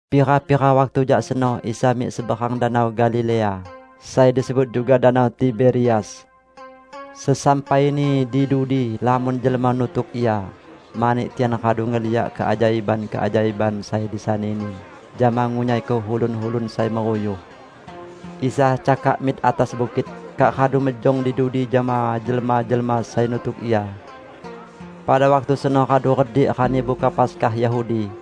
Pira-pira waktu jak seno Isa mik seberang Danau Galilea, sai disebut juga Danau Tiberias. Sesampaini di dudi, lamon jelma nutuk Ia mani tian radu ngeliak keajaiban-keajaiban sai disani-Ni jama ngunyaiko ulun-ulun sai meruyuh. Isa cakak mik atas bukit, kak radu mejong di dudi jama jelma-jelma sai nutuk Ia. Pada waktu seno radu redik Rani Buka Paskah Yahudi.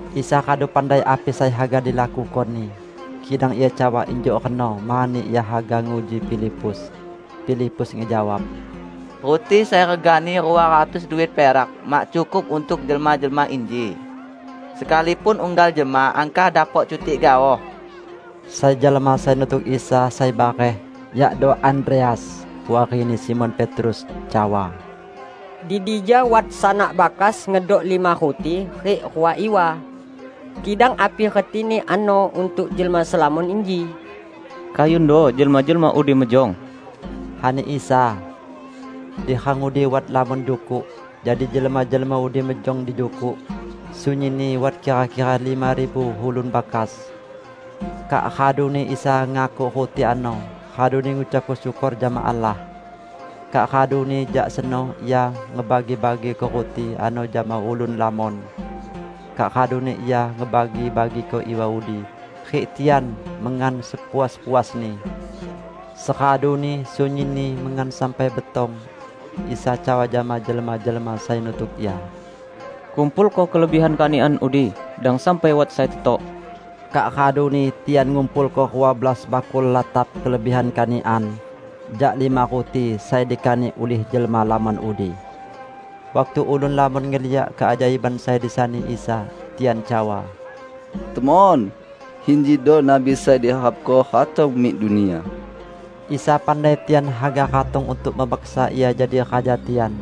Isa radu pandai api sai haga dilakuko-Ni, kidang Ia cawa injuk reno mani Ia haga nguji Filipus.) Filipus ngejawab, "Ruti sai regani rua ratus duit perak mak cukup untuk jelma-jelma inji, sekalipun unggal jelma angkah dapok cutik gaoh." Sai jelma sai nutuk Isa sai bareh, yakdo Andreas, puarini Simon Petrus, cawa, "Di dija wat sanak bakas ngedok lima ruti rik rua iwa. Kidang api retini ano untuk jelma selamon inji?" "Kayundo jelma-jelma udi mejong," ani Isa. Di rang udi wat lamon jukuk, jadi jelma-jelma udi mejong di jukuk -- sunyinni wat kira-kira lima ribu ulun bakas. Kak raduni Isa ngakuk ruti ano, raduni ngucap syukor jama Allah. Kak raduni jak seno Ia ngebagi-bagiko ruti ano jama ulun lamon. Kak raduni Ia ngebagi-bagiko iwa udi, rik tian mengan sepuas-puasni. Seraduni sunyinni mengan sampai betong, Isa cawa jama jelma-jelma sai nutuk Ia, "Kumpulko kelebihan kanikan udi; dang sampai wat sai tetok." Kak raduni tian ngumpulko rua belas bakul latap kelebihan kanikan jak lima ruti sai dikanik ulih jelma lamon udi. Waktu ulun lamon ngeliak keajaiban sai disani Isa, tian cawa, "Temon, injido Nabi sai diharapko ratong mik dunia!" Isa pandai tian haga ratong untuk memaksa Ia jadi raja tian.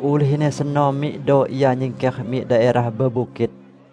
Ulihni seno mikdo Ia nyingker mik daerah bebukit.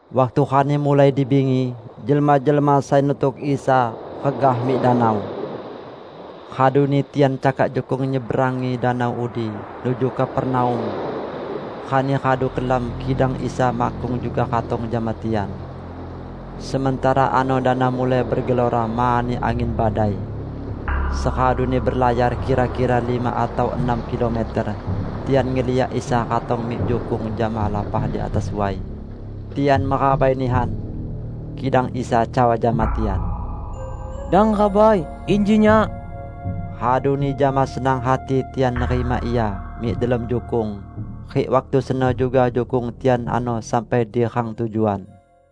Waktu rani mulai di bingi, jelma-jelma sai nutuk Isa regah mik danau. Raduni tian cakak jukung nyeberangi danau udi nuju Kapernaum. Rani radu kelam kidang Isa makkung juga ratong jama tian. Sementara ano danau mulai begelora mani angin badai. Seraduni belayar kira-kira lima atau enam kilometer, tian ngeliak Isa ratong mik jukung jama lapah di atas way. Tian merabai nihan. Kidang Isa cawa jama tian, "Dang rabai, inji Nyak." Raduni jama senang hati tian nerima Ia mik delom jukung, rik waktu seno juga jukung tian ano sampai di rang tujuan.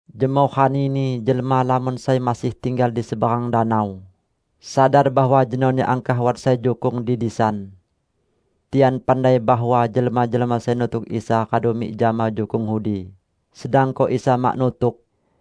Jemoh ranini jelma lamon sai masih tinggal di seberang danau, sadar bahwa jenoni angkah wat sai jukung di disan. Tian pandai bahwa jelma-jelma sai nutuk Isa radu mik jama jukung udi, sedangko Isa mak nutuk.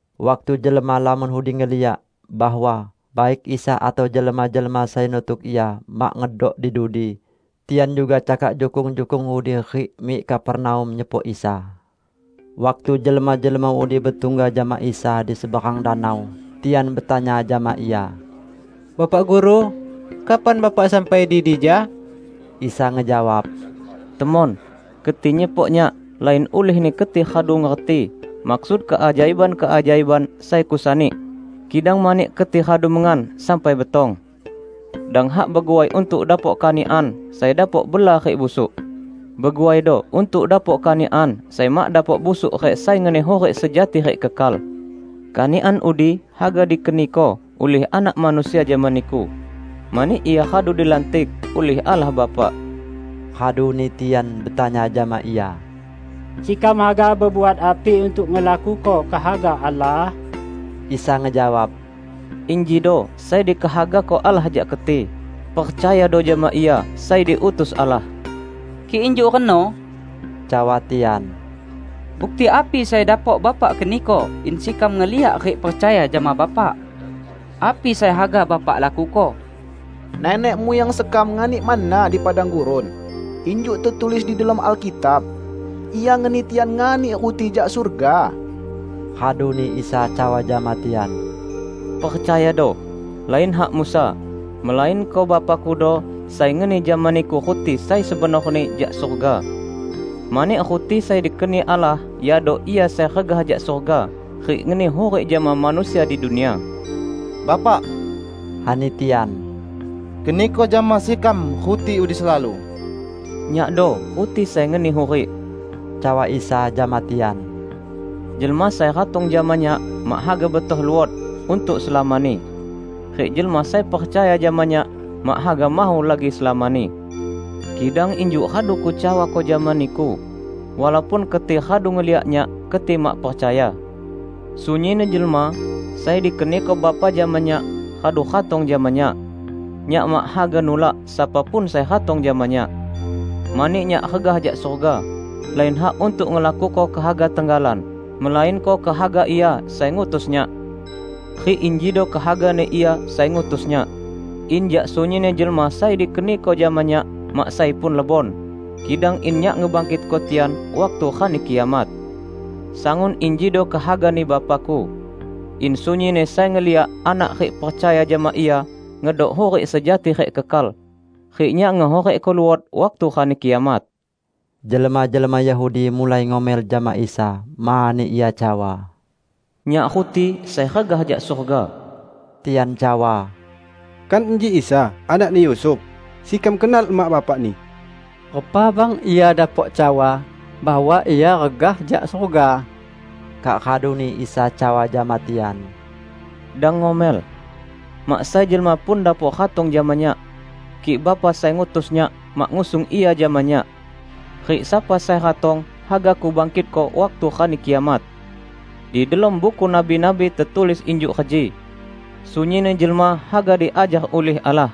Waktu jelma lamon udi ngeliak bahwa baik Isa atau jelma-jelma sai nutuk Ia mak ngedok di dudi, tian juga cakak jukung-jukung udi rik mik Kapernaum nyepok Isa. Waktu jelma-jelma udi betungga jama Isa di seberang danau, tian betanya jama Ia, "Bapak Guru, kapan Bapak sampai di dija?" Isa ngejawab, "Temon, keti nyepok Nyak lain ulihni keti radu ngerti maksud keajaiban-keajaiban sai Kusani, kidang mani keti radu mengan sampai betong. Dang hak beguai untuk dapok kanikan sai dapok bela rik busuk. Beguaido untuk dapok kanikan sai mak dapok busuk rik sai ngeni hurik sejati rik kekal. Kanikan udi haga dikeniko ulih Anak Manusia jama niku, mani Ia radu dilantik ulih Allah Bapa." Raduni tian betanya jama Ia, "Sekam haga bebuat api untuk ngelakuko kehaga Allah?" Isa ngejawab, "Injido sai dikehagako Allah jak keti: percayado jama Ia sai diutus Allah." "Kik injuk reno," cawa tian, "bukti api sai dapok Bapak keniko in sekam ngeliak rik percaya jama Bapak? Api sai haga Bapak lakuko? Nenek muyang sekam nganik manna di padang gurun, injuk tetulis di delom Alkitab, 'Ia ngeni tian nganik ruti jak surga!' " Raduni Isa cawa jama tian, "Percayado: Lain hak Musa, melainko Bapa-Kudo sai ngeni jama niku ruti sai sebenorni jak surga. Mani ruti sai dikeni Allah yakdo Ia sai regah jak surga rik ngeni hurik jama manusia di dunia." "Bapak," ani tian, "keniko jama sekam ruti udi selalu." "Nyakdo ruti sai ngeni hurik," cawa Isa jama tian. "Jelma sai ratong jama Nyak mak haga betoh luot untuk selamani. Rik jelma sai percaya jama Nyak mak haga mahu lagi selamani. Kidang injuk radu Kucawako jama niku, walaupun keti radu ngeliak Nyak, keti mak percaya. Sunyinni jelma sai dikeniko Bapa jama Nyak haga ratong jama Nyak. Nyak mak haga nulak sapa pun sai ratong jama Nyak. Mani Nyak regah jak surga, lain hak untuk ngelakuko kehaga tenggalan, melainko kehaga Ia sai ngutus Nyak. Rik injido kehagani Ia sai ngutus Nyak: in jak sunyinni jelma sai dikeniko jama Nyak, mak sai pun lebon; kidang in Nyak ngebangkitko tian waktu Rani Kiamat. Sangun injido kehagani Bapa-Ku: In sunyinni sai ngeliak Anak rik percaya jama Ia ngedok hurik sejati rik kekal, rik Nyak ngehurikko luot waktu Rani Kiamat." Jelma-jelma Yahudi mulai ngomel jama Isa, mani Ia cawa: "Nyak ruti sai regah jak surga." Tian cawa, "Kan inji Isa, anakni Yusuf? Sekam kenal emak bapak-Ni. Repa bang Ia dapok cawa bahwa Ia regah jak surga?" Kak raduni Isa cawa jama tian, "Dang ngomel. Mak sai jelma pun dapok ratong jama Nyak, kik Bapa sai ngutus Nyak, mak ngusung ia jama Nyak; rik sapa sai ratong, haga Kubangkitko waktu Rani Kiamat. Di delom Buku Nabi-nabi tetulis injuk reji: 'Sunyinni jelma haga diajar ulih Allah.'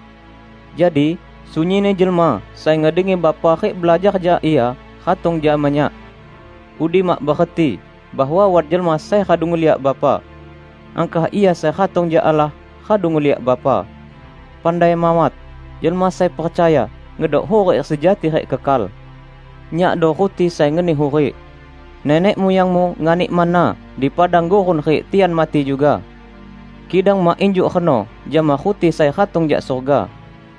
Jadi sunyinni jelma sai ngedengi Bapa rik belajar jak Ia, ratong jama Nyak. Udi mak bereti bahwa wat jelma sai radu ngeliak Bapa. Angkah Ia sai ratong jak Allah, radu ngeliak Bapa. Pandai mawat: Jelma sai percaya, ngedok hurik sejati rik kekal. Nyakdo ruti sai ngeni hurik. Nenek muyangmu nganik manna di padang gurun rik tian mati juga. Kidang mak injuk reno jama ruti sai ratong jak surga;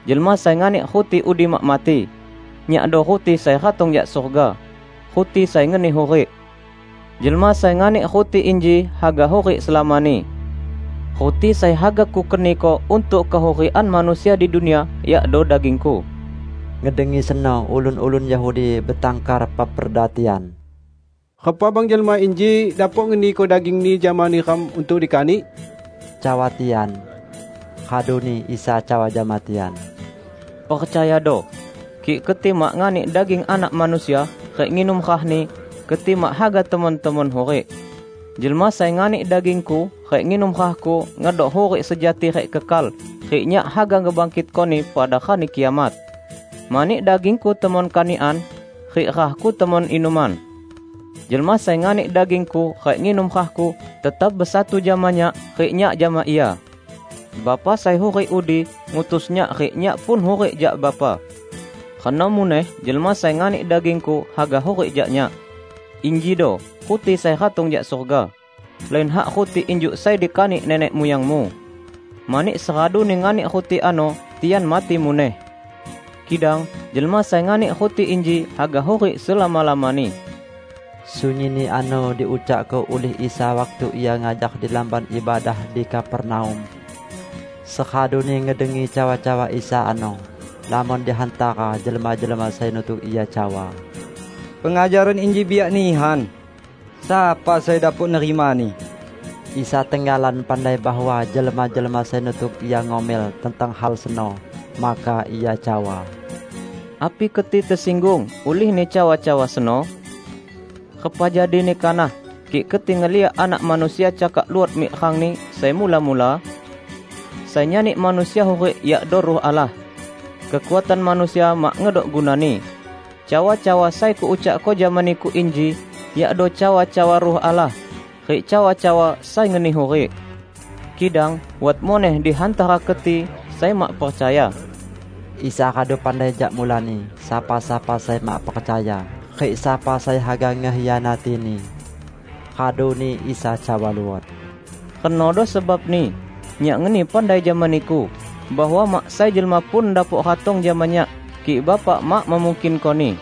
jelma sai nganik ruti udi mak mati. Nyakdo ruti sai ratong jak surga -- ruti sai ngeni hurik. Jelma sai nganik ruti inji haga hurik selamani. Ruti sai haga Kukeniko untuk kehurikan manusia di dunia yakdo daging-Ku." Ngedengi seno, ulun-ulun Yahudi betangkar peperda tian. "Repa bang jelma inji dapok ngeniko daging-Ni jama neram untuk dikanik?" cawa tian. Raduni Isa cawa jama tian, "Percayado: Kik keti mak nganik daging Anak Manusia rik nginum rah-Ni, keti mak haga temon-temon hurik. Jelma sai nganik daging-Ku rik nginum rah-Ku ngedok hurik sejati rik kekal rik Nyak haga ngebangkitkoni pada Rani Kiamat. Mani daging-Ku temon kanikan, rik rah-Ku temon inuman. Jelma sai nganik daging-Ku rik nginum rah-Ku, tetap besatu jama Nyak, rik Nyak jama ia. Bapa sai hurik udi, ngutus Nyak rik Nyak pun hurik jak Bapa. Reno muneh jelma sai nganik daging-Ku haga hurik jak Nyak. Injido ruti sai ratong jak surga: lain hak ruti injuk sai dikanik nenek muyangmu. Mani seraduni nganik ruti ano, tian mati muneh. Kidang jelma sai nganik ruti inji haga hurik selama-lamani." Sunyinni ano diucakko ulih Isa waktu Ia ngajar di lamban ibadah di Kapernaum. Seraduni ngedengi cawa-cawa Isa ano, lamon di hantara jelma-jelma sai nutuk Ia cawa, "Pengajaran inji biak nihan. Sapa sai dapok nerimani?" Isa tenggalan pandai bahwa jelma-jelma sai nutuk Ia ngomel tentang hal seno. Maka Ia cawa, "Api keti tesinggung ulihni cawa-cawa seno? Repa jadini kanah kik keti ngeliak Anak Manusia cakak luot mik rang-Ni sai mula-mula? Sai nyani manusia hurik yakdo Ruh Allah. Kekuatan manusia mak ngedok gunani. Cawa-cawa sai Kuucakko jama niku inji yakdo cawa-cawa Ruh Allah rik cawa-cawa sai ngeni hurik. Kidang wat muneh di hantara keti sai mak percaya." (Isa radu pandai jak mulani, sapa-sapa sai mak percaya, rik sapa sai haga ngekhianati-Ni.) Raduni Isa cawa luot, "Renodo sebabni Nyak ngeni pandai jama niku bahwa mak sai jelma pun dapok ratong jama Nyak, kik Bapa mak memungkinkoni."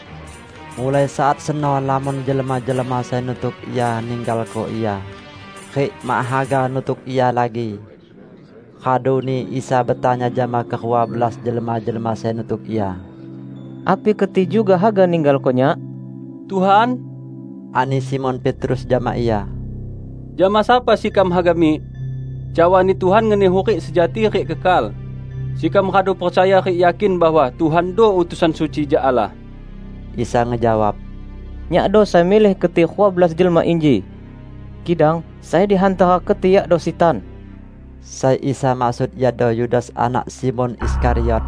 Mulai saat seno lamon jelma-jelma sai nutuk Ia ninggalko Ia, rik mak haga nutuk Ia lagi. Raduni Isa betanya jama kerua belas jelma-jelma sai nutuk Ia, "Api keti juga haga ninggalko Nyak?" "Tuhan," ani Simon Petrus jama Ia, "jama sapa sekam haga mik? Cawani Tuhan ngeni hurik sejati rik kekal. Sekam radu percaya rik yakin bahwa Tuhando utusan suci jak Allah." Isa ngejawab, "Nyakdo sai milih keti rua belas jelma inji? Kidang sai di hantara keti yakdo sitan!" Sai Isa maksud iado Yudas anak Simon Iskariot.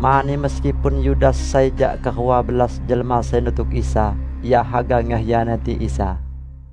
Mani meskipun Yudas sai jak kerua belas jelma sai nutuk Isa, ia haga ngekhianati Isa.